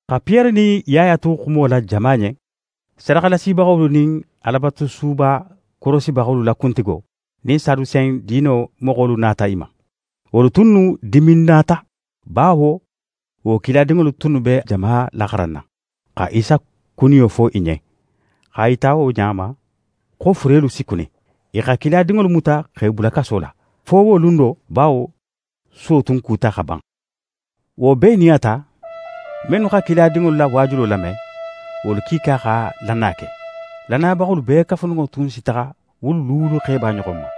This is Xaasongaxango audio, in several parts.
Xa Piyere nin Yaya tu wo xumo la jama ɲen, sadaxalasibaxolu, nin Alabatusuba korosibaxolu la kuntigo, nin Sadusen diino moxolu nata i ma. Wolu tunnu diminnata bawo wo kiladinŋolu tunnu be jama laxaranna, xa Isa kuniyo fo i ɲen, x'a yita wo ɲa ma, xo furelu si kuni. I xa kiladinŋolu muta x'e bula kaso la, fo wo lun do, bawo suwo tun kuta xa ban. Wo bee nin a ta, mennu xa kiladinŋolu la waajulo lame, wolu kiika xa lannaya ke. Lannayabaxolu bee kafuninŋo tun si taxa wulu luulu xeba ɲoxon ma.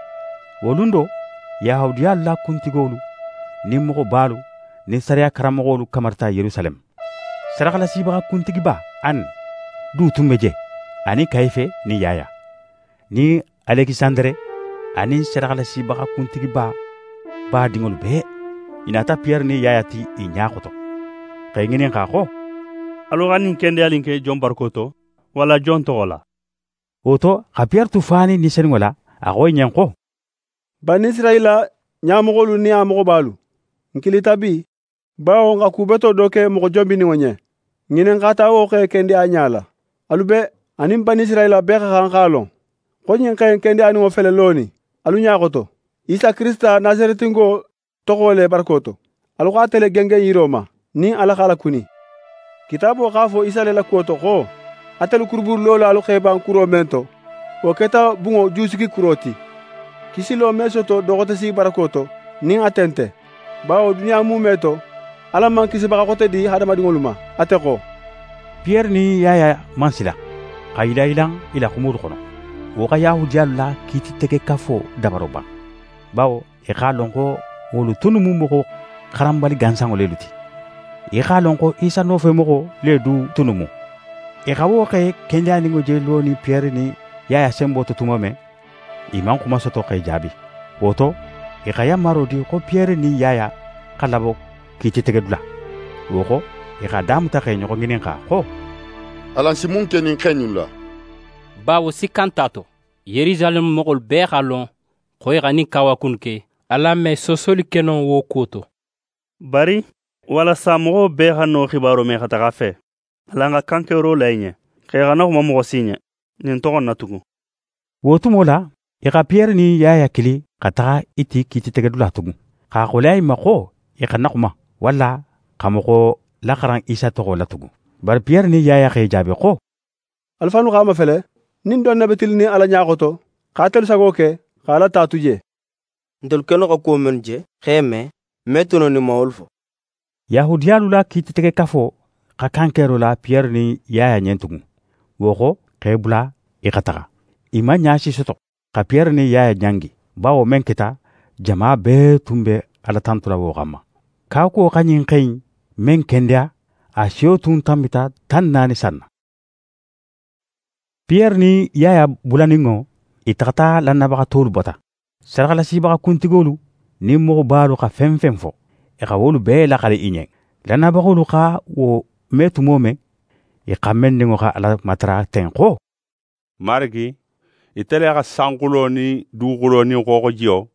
Wo lun do, Yahudiyalu la kuntigolu nin moxobalu nin sariya karanmoxolu kamarita Yerusaleme. Sadaxalasibaxa kuntigiba Ane du tun be je, anin Kayife nin Yaya, nin Alekisandere anin sadaxalasibaxa kuntigiba badinŋolu bee. I nata Piyere nin Yaya ti i ɲa xoto, x'e ŋininxa xo: «Alu xa ɲin kendeyali in ke jon barako to, walla jon toxo la?» Wo to, xa Piyere tu fanin Ni Senunŋo la, a xo i ɲen xo: «Banisirayila ɲamoxolu nin a moxobalu, n kilita bi, bawo n xa ku beto do ke moxo jonbininŋo ɲen. N ŋininxata wo xe kendeyaɲa la. Alu bee, anin Banisirayila bee xa xan x'a lon xo ɲin xe in kendeyaninŋo fele lonin alu ɲa xoto Isa Kirisita Nasaretingo toxo le barako to. Alu xa ate le gengen yiro ma, nin Ala x'a lakuni. Kitaabo x'a fo Isa le la kuwo to xo: “Atelu kurubunlolalu x'e ban kuro men to, wo keta bunŋo jusigikuro ti.” Kisilo me soto do xote si barako to nin ate nte, bawo duniya muume to, Ala man kisibaxa xote di hadamadinŋolu ma ate xo.» Piyere nin Yaya man sila, xa yilanyilan i la xumolu xono. Wo xa Yahudiyalu la Kiititegekafo dabaro ban, bawo i x'a lon xo wolu tunnu mu moxo xaranbali gansanŋo lelu ti. I x'a lon xo Isa nofemoxo le du tunnu mu. I xa wo xe kendeyaninŋo je lonin Piyere nin Yaya senbo to tumo men, i man xuma soto x'e jaabi. Wo to, i xa yanmaro di xo Piyere nin Yaya xa labo kiititegedula. Wo xo, i x'a damuta x'e ɲoxo ŋininxa xo: «Alan si mun ke ɲin xe innu la? Bawo sikka nt'a to, Yerusaleme moxolu bee x'a lon, xo i xa ɲin kawaku in ke. Alan me soosoli ke no wo kuwo to. Bari, walasa moxo bee xana wo xibaro me xa taxa a fe, alan xa kankero la i ɲen, xo i xana xuma moxo si ɲen, ɲin toxo in na tugun.» Wo tumo la, i xa Piyere nin Yaya kili xa taxa i ti kiititegedula tugun, x'a xoleya i ma xo i xana xuma, walla xa moxo laxaran Isa toxo la tugun. Bari Piyere nin Yaya x'e jaabi xo: «Alu fannu x'a mafele nin don ne be tilinnin Ala ɲa xoto xa atelu sago ke, xa Ala ta tu je. Ntelu kennu xa kuwo mennu je, x'e me, n me tu no nin n man wolu fo.» Yahudiyalu la Kiititegekafo xa kankero la Piyere nin Yaya ɲen tugun, wo xo, x'e bula i xa taxa. I man ɲa si soto, xa Piyere nin Yaya ɲangi, bawo men keta, jama bee tun be Ala tantula wo xanma. Kawakuwo xa ɲin xe in men kendeya, a siyo tun tanbita tan naani san na. Piyere nin Yaya bulaninŋo, i taxata lannayabaxa tolu bata. Sadaxalasibaxa kuntigolu nin moxobalu xa fen fen fo, i xa wolu bee laxali i ɲen. Lannayabaxolu xa wo me tumo men, i xanbenninŋo xa Ala matara ten xo: «Marigi, ite le xa sanxulo nin duguxulo nin xooxojiyo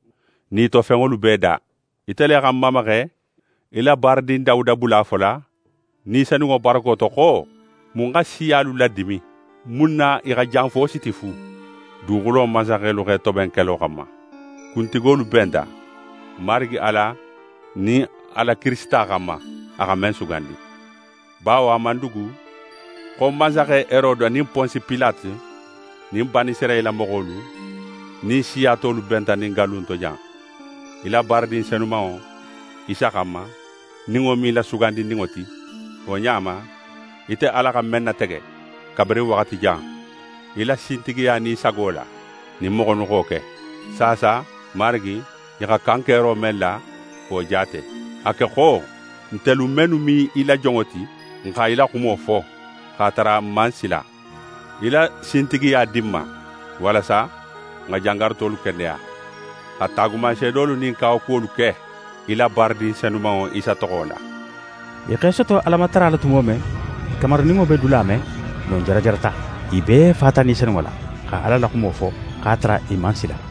nin i to fenŋolu bee da. Ite le xa n mamaxe, í la baaradin Dawuda bula a fola Ni Senunŋo barako to xo: “Mun xa siyalu ladimin? Mun na i xa janfo siti fu? Duguxulo mansaxelu x'e toben kelo xanma, kuntigolu benta Marigi Ala nin a la Kirisita xanma, a xa men sugandi.” Bawo a man dugu xo mansaxe Herode nin Ponsi Pilate nin Banisirayila moxolu nin siya tolu benta ɲin gallu in to jan, í la baaradin senumanŋo, Isa xanma, nin wo mu í la Sugandininŋo ti. Wo ɲa ma, ite Ala xa men natege, kabirin waxati jan, í la sintigiya nin í sago la, ɲin moxo innu xa wo ke. Saasa, Marigi, i xa kankero men la, wo jaate. A ke xo, ntelu mennu mu í la jonŋolu ti, n xa í la xumo fo x'a tara n man sila. Í la sintigiya di n ma, walasa n xa jangarutolu kendeya, xa taagumanseedolu nin kawakuwolu ke, í la baaradin senumanŋo, Isa toxo la.» I x'e soto Alamatara la tumo men, i kamarininŋo be dula men, non jarajarata. I bee fata Ni Senunŋo la, xa Ala la xumo fo, x'a tara i man sila.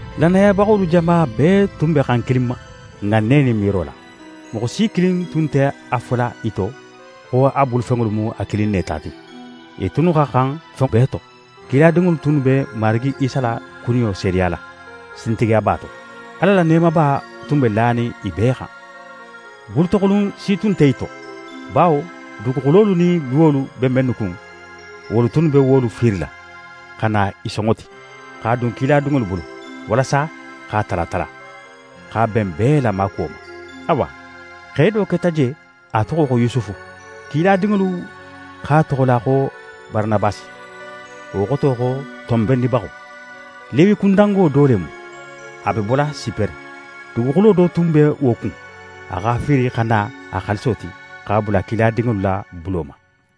Lannayabaxolu jama bee tun be xan kilin ma, ŋanne nin miiro la. Moxo si kilin tun nte a fola i to xo a bulufenŋolu mu a kilin ne ta ti. I tunnu xa xan fenŋo bee to. Kiladinŋolu tunnu be Marigi Isa la kuniyo seedeyala sintigiyaba to. Ala la neemaba tun be lanin i bee xan. Bulutoxulun si tun nte i to, bawo duguxulolu nin luwolu be mennu kun, wolu tunnu be wolu fiirila, xa na i sonŋo ti, x'a dun kiladinŋolu bulu; walasa x'a tala tala, x'a ben bee la maakuwo ma. Awa, xe do keta je, a toxo xo Yusufu. Kiladinŋolu x'a toxola xo Baranabasi, wo xoto xo «tonbennibaxo». Lewikundango do le mu. A be bola Sipere. Duguxulo do tun be wo kun, a x'a fiiri xa na a xaaliso ti, x'a bula kiladinŋolu la bulo ma.